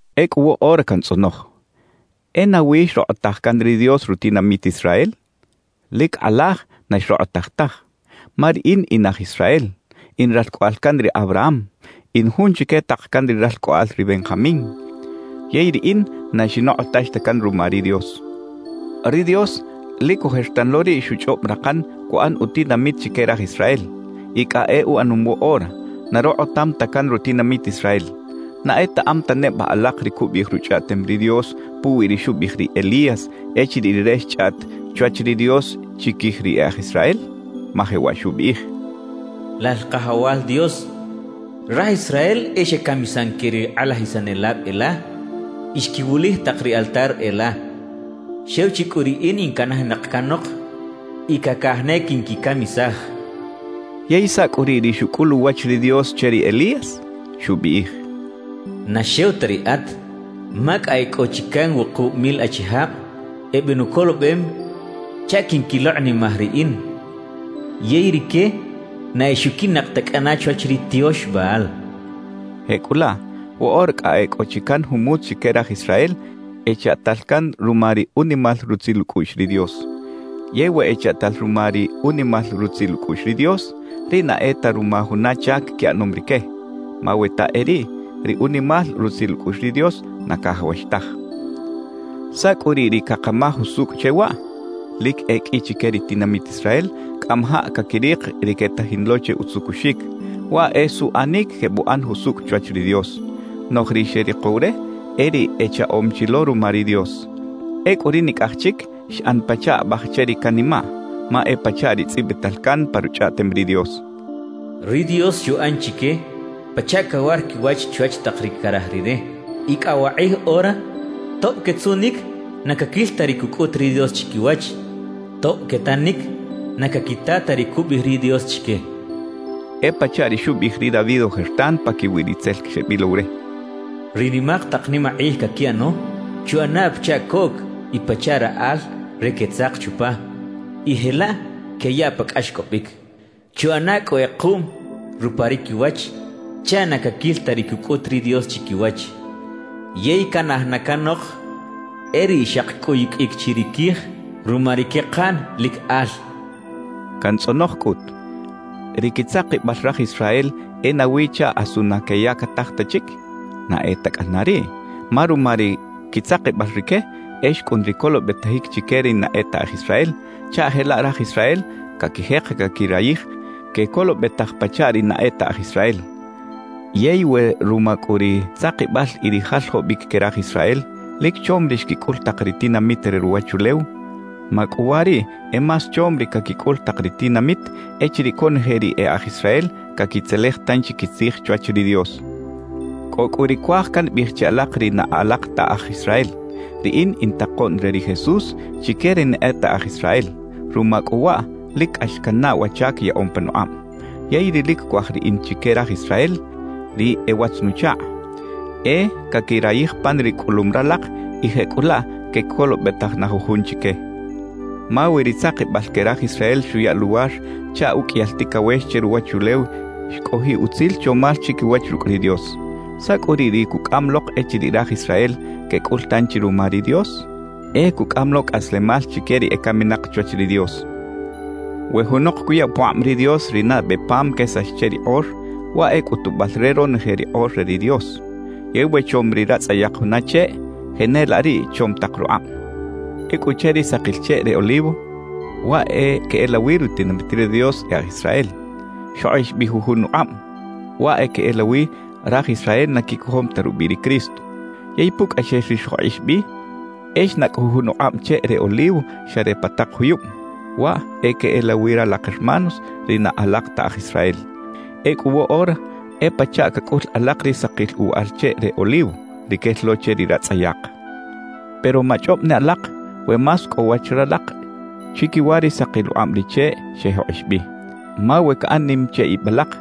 Ecꞌu woꞌora cantzꞌonoj: ¿E nawi xrokꞌotaj can ri Dios rutinamit Israel? ¡Lic kꞌalaj na xrokꞌotaj taj! Ma riꞌin in aj Israel, in ralcꞌoꞌal can ri Abraham, in jun chique tak can ri ralcꞌoꞌal ri Benjamín; yey riꞌin na xinokꞌotax ta can ruma ri Dios. Ri Dios, lic ojertan lo riꞌ xuchꞌob rakan cuꞌan utinamit chique raj Israel; y cꞌa e uꞌanom woꞌora, na rokꞌotam ta can rutinamit Israel. ¿Na etaꞌam ta neba alak ri cubiꞌij Ruchꞌaꞌtem ri Dios puwi ri xubiꞌij ri Elías echiriꞌ rire xchꞌaꞌt chwach ri Dios chiquij ri e aj Israel? Ma jewaꞌ xubiꞌij: Lal Kajawal Dios, raj Israel e xecamisan que ri kꞌalajisanelab e la y xquiwulij tak ri altar e la. Xew chi cꞌu riꞌin in canajinak canok y cacaj ne quinquicamisaj xchaꞌ. ¿Yey saꞌ cꞌu riꞌ ri xucꞌul uwach ri Dios che ri Elías? Xubiꞌij: Na xew ta riꞌat, ma cꞌa e cꞌo chi can wukub mil achijab ebenucolobem chaꞌ quinquilokꞌnimaj Riꞌin yey rique na exuquiꞌnak ta cꞌana chwach ri tiox Baal xcha ri Dios che. Jecꞌulaꞌ woꞌora cꞌa e cꞌo chi can jumutz chique raj Israel echaꞌtal can ruma ri unimal rutzil ucꞌuꞌx ri Dios. Yey we echaꞌtal ruma ri unimal rutzil ucꞌuꞌx ri Dios, riꞌ na e ta ruma juna chac quiꞌanom rique. Ma we ta e riꞌ, ri unimal rutzil ucꞌuꞌx ri Dios na cajawax taj. ¿Saꞌ cꞌu riꞌ ri cakamaj usucꞌ che waꞌ? Lic e qꞌui chique ri tinamit Israel cꞌamajaꞌ caquirik ri quetajin lo che utzucuxic, waꞌ e suꞌanic quebuꞌan jusucꞌ chwach ri Dios. Noꞌj ri xerikow re, e ri echaꞌom chi lo ruma ri Dios. Ecꞌu ri nicꞌaj chic xꞌan pachaꞌ abaj che ri canimaꞌ. Ma e pachaꞌ ri tzꞌibital can pa Ruchꞌaꞌtem ri Dios: Ri Dios xuꞌan chique pachaꞌ cawar quiwach chwach tak ri caraj Rire; y cꞌa wakꞌij ora tob quetzuꞌnic, na caquil ta ri cucꞌut ri Dios chiquiwach; tob quetanic, na caquita ta ri cubiꞌij ri Dios chique. E pachaꞌ ri xubiꞌij ri David ojertan paquiwi ri tzel xebilow re: Ri nimak tak nimakꞌij caquiꞌano, chuꞌana pachaꞌ coꞌc y pachaꞌ raꞌal re quetzak chupa, y jelaꞌ queyaꞌ pa cꞌaxcꞌobic. Chuꞌana cꞌu kꞌekuꞌm rupa ri quiwach chaꞌ na caquil ta ri cucꞌut ri Dios chiquiwach; Yey canaj na canok e riꞌ xaki cꞌuyuqꞌuic chi ri quij ruma ri quekaꞌn lic al xchaꞌ. Cantzꞌonoj cꞌut: ¿Ri quitzakibal raj Israel e nawi chaꞌ asu na queyactaj ta chic? ¡Na e ta cꞌana riꞌ! Ma ruma ri quitzakibal rique, e xcꞌun ri colobetajic chique ri na e ta aj Israel, chaꞌ jelaꞌ raj Israel caquijek caquirayij quecolobetaj pachaꞌ ri na e ta aj Israel. Yey we ruma cꞌu ri tzakibal y ri jaljobic que raj Israel, lic chom ri xquicꞌul tak ri tinamit re ruwachulew, ¡macꞌuwariꞌ e más chom ri caquicꞌul tak ri tinamit echiriꞌ conoje ri e aj Israel caquitzelej tanchi quitzij chwach ri Dios! Cꞌo cꞌu ri cuaj cambiꞌij che alak ri na alak ta aj Israel. Riꞌin in takoꞌn re ri Jesús chique ri na e ta aj Israel. Ruma cꞌu waꞌ, lic cꞌax cannaꞌ wa chac yaꞌom panukꞌab. Yey ri lic cuaj riꞌin chique raj Israel, ri e watz-nuchakꞌ, e caquirayij pan ri cꞌulum ralak y jecꞌulaꞌ quecolobetaj na jujun chique. Ma we ri tzakibal que raj Israel xuya luwar chaꞌ uqꞌuiyal ticawex che ruwachulew xcꞌojiꞌ utzil chomal chiquiwach rucꞌ ri Dios, ¿saꞌ cꞌu riꞌ ri cucꞌam lok echiriꞌ raj Israel quecꞌul tanchi ruma ri Dios? ¡E cucꞌam lo cꞌaslemal chique ri ecaminak chwach ri Dios! We junok cuya pukꞌab ri Dios ri nabe pam quesax che ri kꞌor, waꞌ e cꞌutubal re ronoje ri kꞌor re ri Dios. Yey we chom ri ratzꞌayak juna cheꞌ, jenelaꞌ riꞌ chom tak rukꞌab. Ecꞌu che ri sakil cheꞌ re olivo (waꞌ e queꞌelawi rutinamit ri Dios e aj Israel) xjokꞌix bi jujun ukꞌab (waꞌ e queꞌelawi raj Israel na quicojom ta rubiꞌ ri Cristo). Yey pucꞌaxel ri xjokꞌix bi, e xnacꞌ jujun ukꞌab cheꞌ re olivo xa re pa tak juyub (waꞌ e queꞌelawi ralak hermanos, ri na alak ta aj Israel). Ecꞌu woꞌora e pachaꞌ cacꞌul alak ri sakil uwaꞌal cheꞌ re olivo, ri quel lo che ri ratzꞌayak. Pero machꞌob ne alak we más cꞌo wach ralak chiquiwa ri sakil ukꞌab ri cheꞌ xejokꞌix bi. Ma we caꞌan nim che ib alak,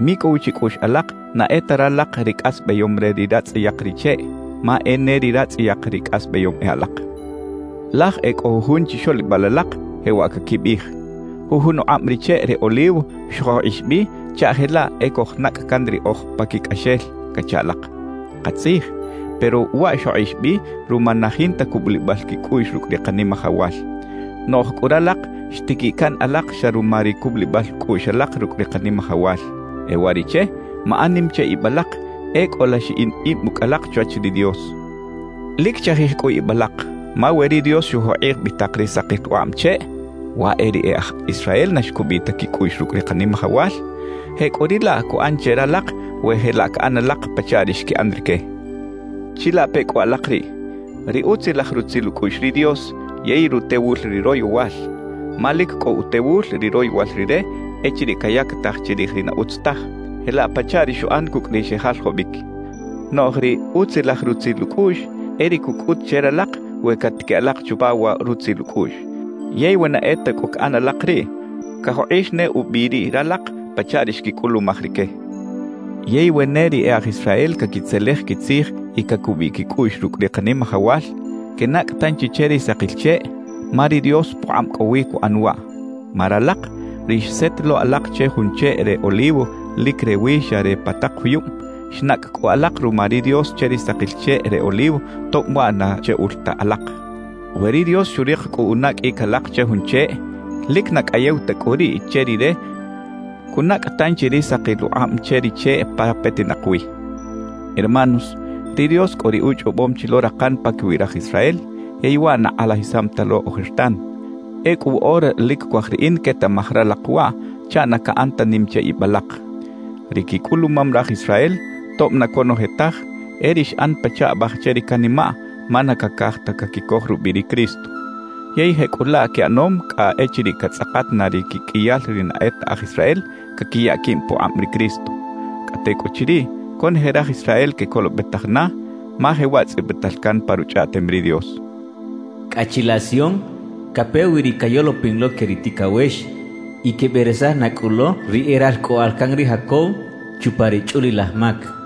micꞌow chicꞌuꞌx alak na e ta ralak ri cꞌasbayom re ri ratzꞌayak ri cheꞌ, ma e ne ri ratzꞌayak ri cꞌasbayom e alak. Laj e cꞌo jujun chixoꞌlibal alak jewaꞌ caquibiꞌij: «Jujun ukꞌab ri cheꞌ re olivo xjokꞌix bi chaꞌ jelaꞌ e cojnacꞌ can riꞌoj paquicꞌaxel» cacha alak. Katzij, pero waꞌ xjokꞌix bi ruma na jinta cubulibal quicꞌuꞌx rucꞌ ri Kanimajawal. Noꞌj cꞌu ralak xtiquiꞌ can alak xa ruma ri cubulibal cꞌuꞌx alak rucꞌ ri Kanimajawal. E uwariꞌche, maꞌan nim che ib alak; e cꞌola xiꞌin ib ucꞌ alak chwach ri Dios. Lic chajij cꞌu ib alak, ma we ri Dios xujokꞌij bi tak ri sakil ukꞌab cheꞌ (waꞌ e ri e aj Israel na xcubiꞌ ta quicꞌuꞌx rucꞌ ri Kanimajawal), jecꞌuriꞌlaꞌ cuꞌan che ralak we jelaꞌ caꞌan alak pachaꞌ ri xquiꞌan rique. Chilape cꞌu alak riꞌ: Ri utzilaj rutzil ucꞌuꞌx ri Dios yey rutewul ri royowal. Ma lic cꞌo utewul ri royowal Rire echiriꞌ cayactaj chirij ri na utz taj, jelaꞌ pachaꞌ ri xuꞌan cucꞌ ri xejaljobic. Noꞌj ri utzilaj rutzil ucꞌuꞌx e ri cucꞌut che ralak we catiquiꞌ alak chupa wa rutzil ucꞌuꞌx. Yey we na e ta cꞌu caꞌan alak riꞌ, cajokꞌix ne ubi riꞌ ralak pachaꞌ ri xquicꞌulumaj rique. Yey we ne ri e aj Israel caquitzelej quitzij y cacubiꞌ quicꞌuꞌx rucꞌ ri Kanimajawal, quenacꞌ tanchi che ri sakil cheꞌ, ma ri Dios pukꞌab cꞌo wi cuꞌan waꞌ. Ma ralak, ri xset lo alak che jun cheꞌ re olivo lic rewi xa re pa tak juyub, xnacꞌ cꞌu alak ruma ri Dios che ri sakil cheꞌ re olivo tob waꞌ na cheꞌul ta alak. We ri Dios xurik cꞌu unaqꞌuic alak che jun cheꞌ, lic na cꞌayew ta cꞌu riꞌ che Rire cunacꞌ tanchi ri sakil ukꞌab che ri cheꞌ pa petinak wi. Hermanos, ri Dios cꞌo ri uchꞌobom chi lo rakan paquiwi raj Israel, yey waꞌ na kꞌalajisam ta lo ojertan. Ecꞌu woꞌora lic cuaj riꞌin quetaꞌmaj ralak waꞌ chaꞌ na caꞌan ta nim che ib alak. Ri quicꞌulumam raj Israel, tob na conoje taj, e ri xꞌan pachaꞌ abaj che ri canimaꞌ, ma na cacaj ta caquicoj rubiꞌ ri Cristo. Yey jecꞌulaꞌ quiꞌanom cꞌa echiriꞌ catzꞌakat na ri quiqꞌuiyal ri na e ta aj Israel caquiya quib pukꞌab ri Cristo. Cꞌa tecꞌuchiriꞌ conoje raj Israel quecolobetaj na, ma jewaꞌ tzꞌibital can pa Ruchꞌaꞌtem ri Dios: Cꞌa chilaꞌ Sion cape wi ri cayolopin lo que ri ticawex y queberesaj na cꞌu lo ri e ralcꞌoꞌal can ri Jacob chupa ri chꞌulilaj mac.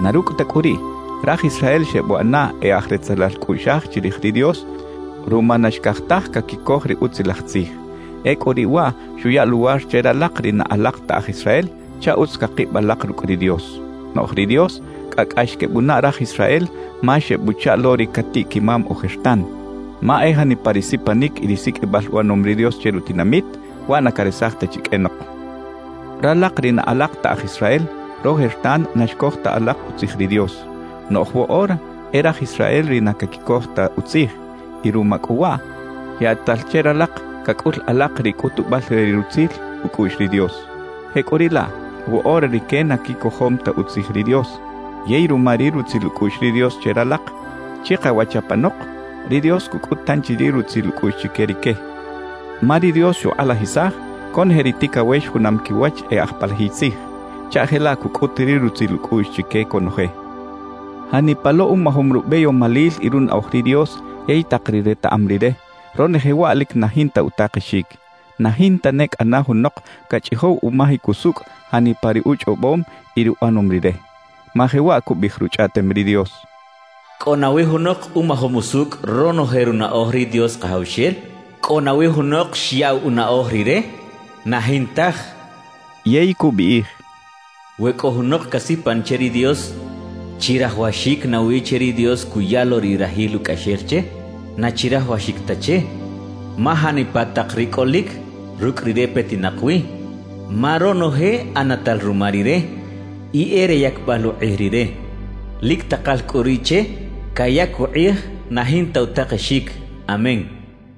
Na rucꞌ ta cꞌu riꞌ, raj Israel xebuꞌana e aj retzelal cꞌuꞌxaj chirij ri Dios ruma na xcaj taj caquicoj ri Utzilaj Tzij. Ecꞌu riꞌ waꞌ xuya luwar che ralak ri na alak ta aj Israel chaꞌ utz cakib alak rucꞌ ri Dios. Noꞌj ri Dios cꞌa cꞌax quebunaꞌ raj Israel ma xebuchaꞌ lo ri catiꞌ-quimam ojertan. Ma e janipa ri sipanic y ri siqꞌuibal uꞌanom ri Dios che rutinamit, waꞌ na caresaj ta chi qꞌuenok. Ralak ri na alak ta aj Israel, rojertan na xcoj ta alak utzij ri Dios. Noꞌj woꞌora e raj Israel ri na caquicoj ta utzij; y ruma cꞌu waꞌ, yaꞌtal che ralak cacꞌul alak ri cꞌutubal re ri rutzil ucꞌuꞌx ri Dios. Jecꞌuriꞌlaꞌ, woꞌora rique na quicojom ta utzij ri Dios; yey ruma ri rutzil ucꞌuꞌx ri Dios che ralak, chikawach apanok ri Dios cucꞌut tanchi ri rutzil ucꞌuꞌx chique rique. Ma ri Dios xukꞌalajisaj conoje ri ticawex junam quiwach e aj palajiy tzij, chaꞌ jelaꞌ cucꞌut ri rutzil ucꞌuꞌx chique conoje. ¡Janipa lo umajom rubeyomalil y runaꞌoj ri Dios yey tak ri retaꞌam Rire; ronoje waꞌ lic na jinta utakexic! ¡Na jinta ne cꞌana junok cachꞌijow umajic usucꞌ janipa ri uchꞌobom y ri uꞌanom Rire! Ma jewaꞌ cubiꞌij Ruchꞌaꞌtem ri Dios: ¿Cꞌo nawi junok umajom usucꞌ ronoje runaꞌoj ri Dios Kajawxel? ¿Cꞌo nawi junok xyaꞌw unaꞌoj Rire? ¡Na jintaj! cachaꞌ. Yey cubiꞌij: We cꞌo junok casipan che ri Dios, ¿chirajawaxic nawi che ri Dios cuya lo ri rajil ucꞌaxel che? ¡Na chirajawaxic ta che! Ma janipa tak ri cꞌolic, rucꞌ Rire petinak wi; ma ronoje ꞌanatal ruma Rire y e re yacbal ukꞌij Rire. ¡Lic takal cꞌu riꞌ che cayac ukꞌij na jinta utakexic! ¡Amén!